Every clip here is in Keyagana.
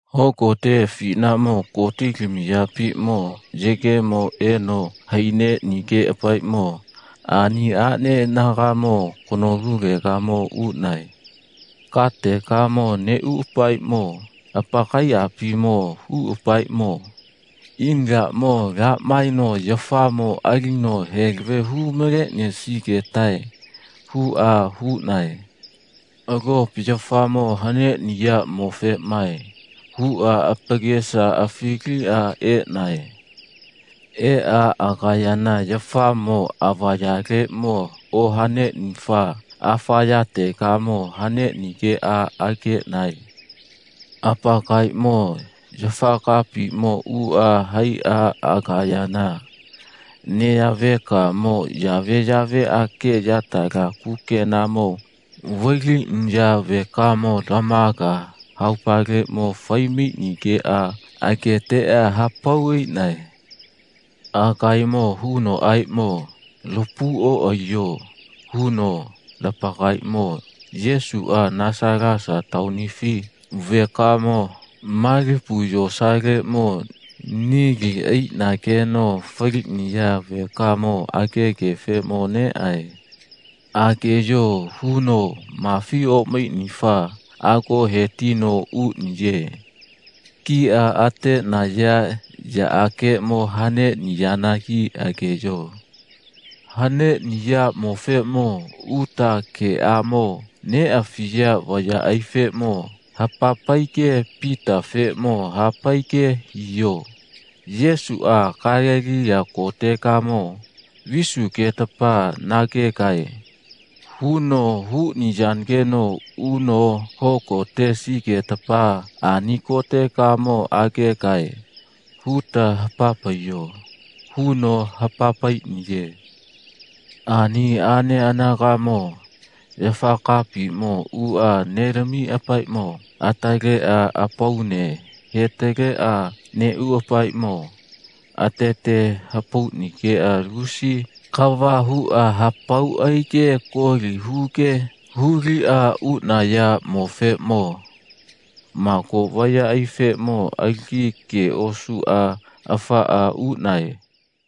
Hogote afinaʼmo gotilamiyapiʼmo yegemo eno haineʼnigeʼapaeʼmo ani aʼne anagamo kanolulegamo uʼnae. Kategamo neʼuʼapaeʼmo apakaiʼapimo huʼapaeʼmo, ina laʼmo laha maeno yafaʼmo alino heleve hu maleʼnisigetae, huʼa huʼnae. Alopa yafaʼmo haneʼniyaʼmofeʼmae, huʼa apakesa afiliʼa eʼnae. Eʼa agayana yafaʼmo avayaleʼmo ohaneʼnifa afayategakeʼmo haneʼnigeʼa ageʼnae. Apakaemo yafakapiʼmo uʼa haiʼa agayana neya vekamo yaveyaveʼage yatala kukenamo vailiʼniya vekamo lamaga haopaleʼmo fai maiʼnigeʼa ageteʼa hapau aiʼnae. Agaemo hunoʼaeʼmo, lapau oʼaiyo, huno, lapakaemo Yesuʼa Nasalasa taonifi vekamo malipu yosaleʼmo nili aiʼnageno faliʼniya vekamo agegefeʼmo neʼae. Ageyo, huno, Mafi oʼmaiʼnifa ago he tino uʼniye. Kiʼa ateʼnaya yaʼageʼmo haneʼniyanagi ageyo. Haneʼniyaʼmofeʼmo uta geʼamo neʼafiya vayaʼaifeʼmo hapa paige Pitafeʼmo ha paige hiyo. Yesuʼa Galeliya kotegamo visugetapa nagegae, huno huʼniyanageno uno hogonetesigetapa ani kotegamo agegae, huta hapa paiyo, huno hapa paiʼniye. Ani aʼne anagaʼmo yafa kapatiʼmo uʼa nelamiʼapaeʼmo ataleʼa apaune hetaleʼa neʼuʼapaeʼmo atete hapauge lusi kava huʼa hapau aige koli huge huliʼa uʼnayaʼmofeʼmo mago vayaʼaifeʼmo alagi ge osuʼa afaʼa uʼnae.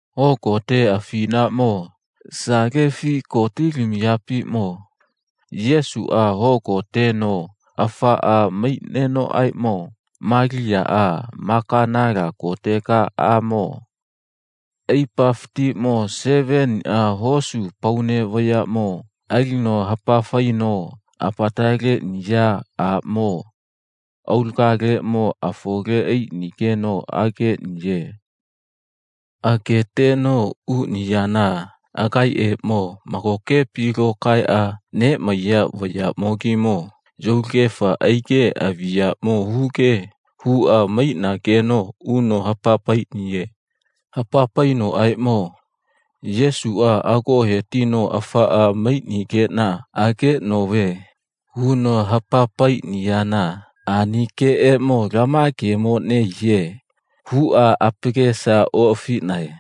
Hogote afinaʼmo salefi gotilamiyapiʼmo Yesuʼa hogoteno afaʼa maiʼnenoʼaeʼmo Maliyaʼa Maganala kotega aʼmo aipafatiʼmo seveniʼa hosu apaune vayaʼmo alino hapa faino apataleʼniya aʼmo aulagaleʼmo afole aiʼnigeno ageʼniye. Ageteno uʼniyana agaeʼeʼmo magokepi lokaeʼa neʼmaiya vayaʼmogimo yulagefa aige aviʼyaʼmo huge huʼa maiʼnageno uno hapa paiʼniye. Hapa painoʼaeʼmo, Yesuʼa ago he tino afaʼa maiʼnigeʼna ageʼnove, huno hapa paiʼniyana ani geeʼmo lama ge nehiye, huʼa apakesa oʼafiʼnae.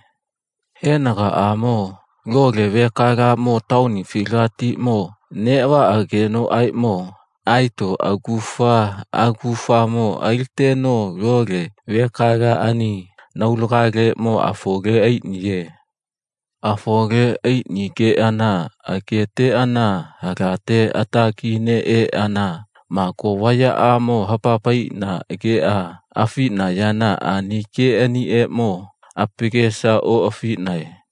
Henagaʼamo lole vekalaʼmo taonifilagatiʼmo neʼvaʼagenoʼaeʼmo aeto agufa agufamo aliteno lole vekalaʼani anaulagaleʼmo afole aiʼniye. Afole aiʼnigeʼana ageteʼana halate atagi neʼeʼana mago vayaʼamo hapa paiʼnaʼageʼa afiʼnayana ani geʼanieʼmo apakesamo oʼafiʼnae.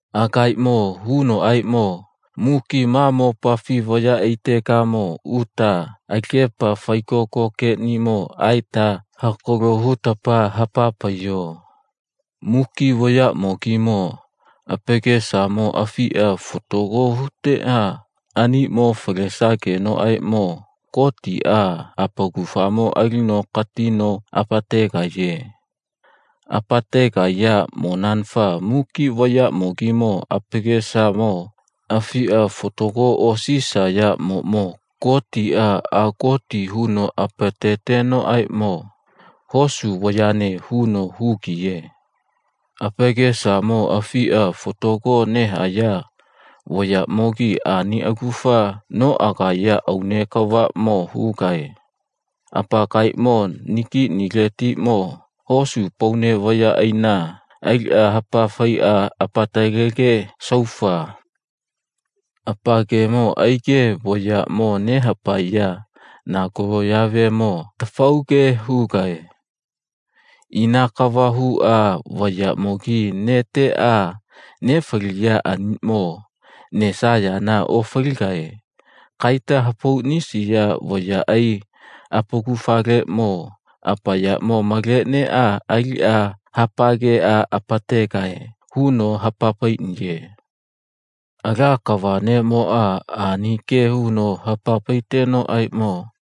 Agaemo hunoʼaeʼmo, muki ma mopafi vayaʼaitegamo uta alagepa faigoko geʼnimo aeta hakalo hutapa hapa paiyo. Muki vayaʼmogimo apakesamo afiʼa fatago huteʼa aniʼmo falesagenoʼaeʼmo Gotiʼa apakufamo alino katino apategaiye. Apategaiyaʼmonanafa muki vayaʼmogimo apakesamo afiʼa fatago osisayaʼmoʼmo Gotiʼa agoti huno apatetenoʼaeʼmo, hosu vayane, huno hugiye. Apakesamo afiʼa fatago nehaya vayaʼmogi ani agufa noʼagaya aune kavaʼmo hugae. Apakaemo nagiʼniletiʼmo hosu apaune vayaʼaina aliʼa hapa faiʼa apatalege saufa apakemo aige vayaʼmo nehapaeya nakaloʼyavemo atafauge hugae. Ina kava huʼa vayaʼmogi neteʼa nefaliya aniʼmo nesayana ofaligae. Kaita hapauʼnisiya vayaʼai apakufaleʼmo apayaʼmo maleʼneʼa aliʼa hapageʼa apategae, huno hapa paiʼniye. Ala kava neʼmoʼa ani ge huno hapa paitegenoʼaeʼmo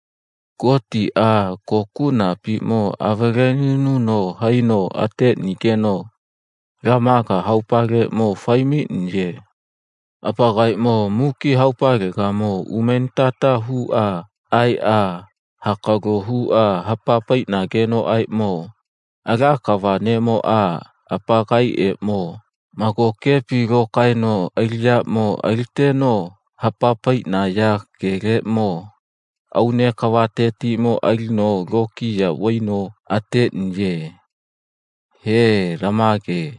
Gotiʼa kokuʼnapiʼmo avalelinuno haino ateʼnigeno lamaga haopaleʼmo fai maiʼniye. Apakaemo muki haopalegamo umenitata huʼa aeʼa hakalo huʼa hapa paiʼnagenoʼaeʼmo Ala kava neʼmoʼa apakaeʼeʼmo magokepi lokaeno aliʼyaʼmo aliteno hapa paiʼnaya geleʼmo aune kavatetiʼmo alino lokiya vaino ateʼniye. He, lama ge.